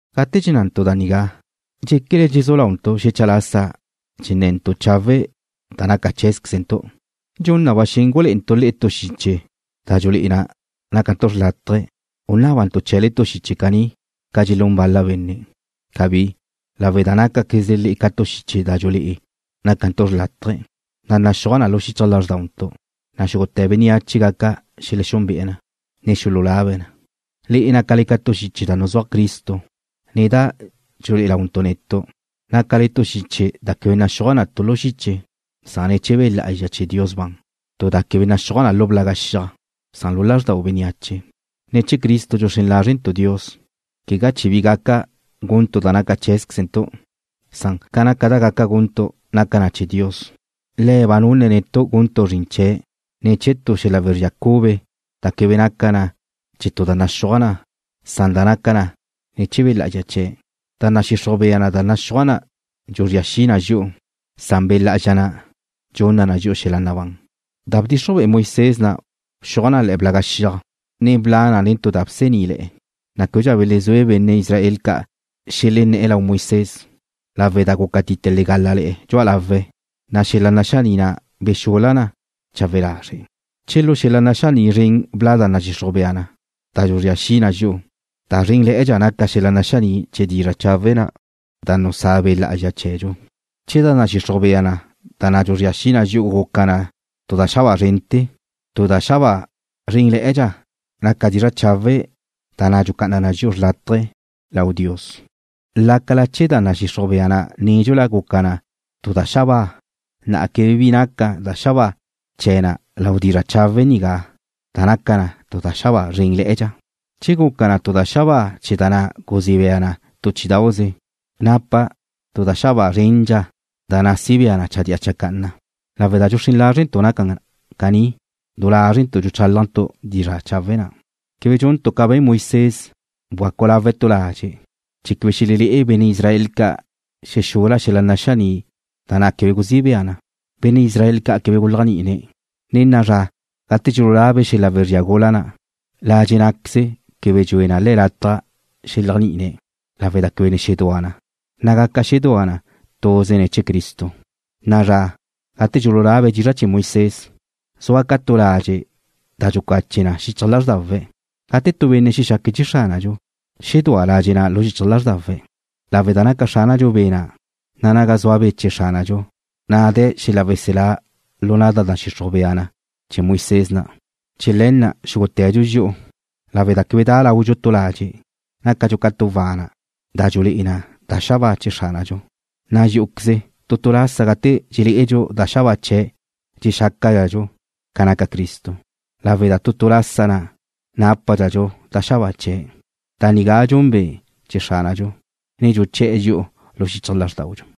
Gate dxennantu' da nigá, ¿dxéquele dxezú launtu' xecha lasa dxenne̱ntu' chawe' da naca cheé̱zquezentu'? ¿Dxun na ba xen gulé'entu' le'e tu xiche da dxulé'e na nácantu' xrlátaje, u nábantu' chee̱le tu xiche caní, ca dxelún bal-la benne'? ¡Cabí! Lawe' da nácaquezle le'e ca tu xiche da dxulé'e na nácantu' xrlátaje, da naxúaj na lu xichaj lázrdauntu', na' xúgute̱ bénneache gaca xelexúnbe'e̱ na, ne xululabe̱' na. Le'e nácale ca tu xiche da nuzúaj Cristo, ne da dxulé'e launtu' netu'. Nácale ca tu da naxúaj na da quebe naca na tu lu xiche, san ne̱ chee̱ Be' Lá'azxa chee̱ Dios ban, tu da quebe naxúaj na lu blaga xiaj, san lu lázrdaudxu. Ne̱ chee̱ Cristo dxuxrén lázrentu' Dios, quegá chee̱ bi gaca guntu' da naca cheé̱zquezentu', san, ca naca da gaca guntu' naca na chee̱ Dios. Le̱' ba nunne̱' netu' guntu' zrin chee̱' ne̱ chee̱ tu xel-la wezría cube da quebe naca na ne̱ chee̱ tu da naxúaj na, san da naca na ne̱ chee̱ Be' Lá'azxa chee̱'. Da nadxixruj bea na da naxúaj na dxuzría xi na dxi'u, san Be' Lá'azxa na' dxunna dxi'u xel-la nabán. Da bdxixruj be'e Moisés na' bxuaj na le̱'e̱ xiaj blaga', ne bla' nen tu da bsení'le̱'e̱, na' québedxa belezúe benne' Israel ca' xelené̱'e̱ lau Moisés, lawe' da gúcatite legala le̱'e̱ dxu'a lawe̱', na' xel-la naxaní' na' bexul-la na chawe lazre'. Che lu xel-la naxaní' zren bla' da nadxixruj bea na, da dxuzría xi na dxi'u, da zrénle̱'e̱dxa naca xel-la naxaní' chee̱ dizra' chawe' na' da nusá Be' Lá'azxa chee̱dxu. Che da nadxixruj bea na da dxuzría xi na dxi'u guca na tu da xabáa zrente̱, na' tu da xabáa zrénle̱'e̱dxa naca dizra' chawe' na' da dxucá'ana na dxi'u xrlátaje lau Dios. Lácala che da nadxixruj bea na nédxula guca na tu da xabáa, na'a quebe bi naca xabáa chee̱ na lau dizra' chawe' nigá da naca na tu da xabáa zrénle̱'e̱dxa. Che guca tu da xabáa chee̱ da na' guzí bea na tu chí'idauze, napa na tu da xabáa zrénle̱'e̱dxa da na' si bea na chadía chacanna. Lawe' da dxuxrén lázrentu' naca na caní, du lázrentu' dxuchálajntu' dizra' chawe' na'. Quebe dxuntu' ca be̱n Moisés, bgacu lawe̱' tu ladxe' chee̱ quebe xelelé'e benne' Israel ca' xexul-la xel-la naxaní' na' da quebe guzí bea na. Benne' Israel ca' quebe guléajni'ine̱'. Ne na'a zra, gate dxululabe̱' xel-la wezría gula na', ladxe' ná'queze quebe dxue na le̱' lataj xeléajni'ine̱', lawe' da quebe ne xedúa na, na' gaca xedúa na tuze ne̱ chee̱ Cristo. Na'a zra, gate dxululabe̱' dizra' chee̱ Moisés, zua ca tu ladxe' da dxucache na xichaj lázrdawe̱'. Gate tu benne' xexaque̱' chee̱ Xránadxu, xedúa ladxe' na' lu xichaj lázrdawe̱', lawe' da naca Xránadxu Be' na', na' naga zua Be' chee̱ Xránadxu, na' de̱ xel-la weselá lu na' da nadxixruj bea na chee̱ Moisés na'. Chee̱ le̱ na' xúgute̱dxu dxi'u, lawe' da quebe da' laudxu tu ladxe', nácadxu ca tu wana' da dxulé'e na da xabáa chee̱ Xránadxu, na' dxí'uqueze, tu tu lasa gate dxelé'edxu da xabáa chee̱' dxexácadxadxu ca naca Cristo, lawe' da tu tu lasa na' nápadxadxu da xabáa chee̱'. Da nigá dxun Be' chee̱ Xránadxu, na dxuché̱'e̱ dxi'u lu xichaj lázrdaudxu.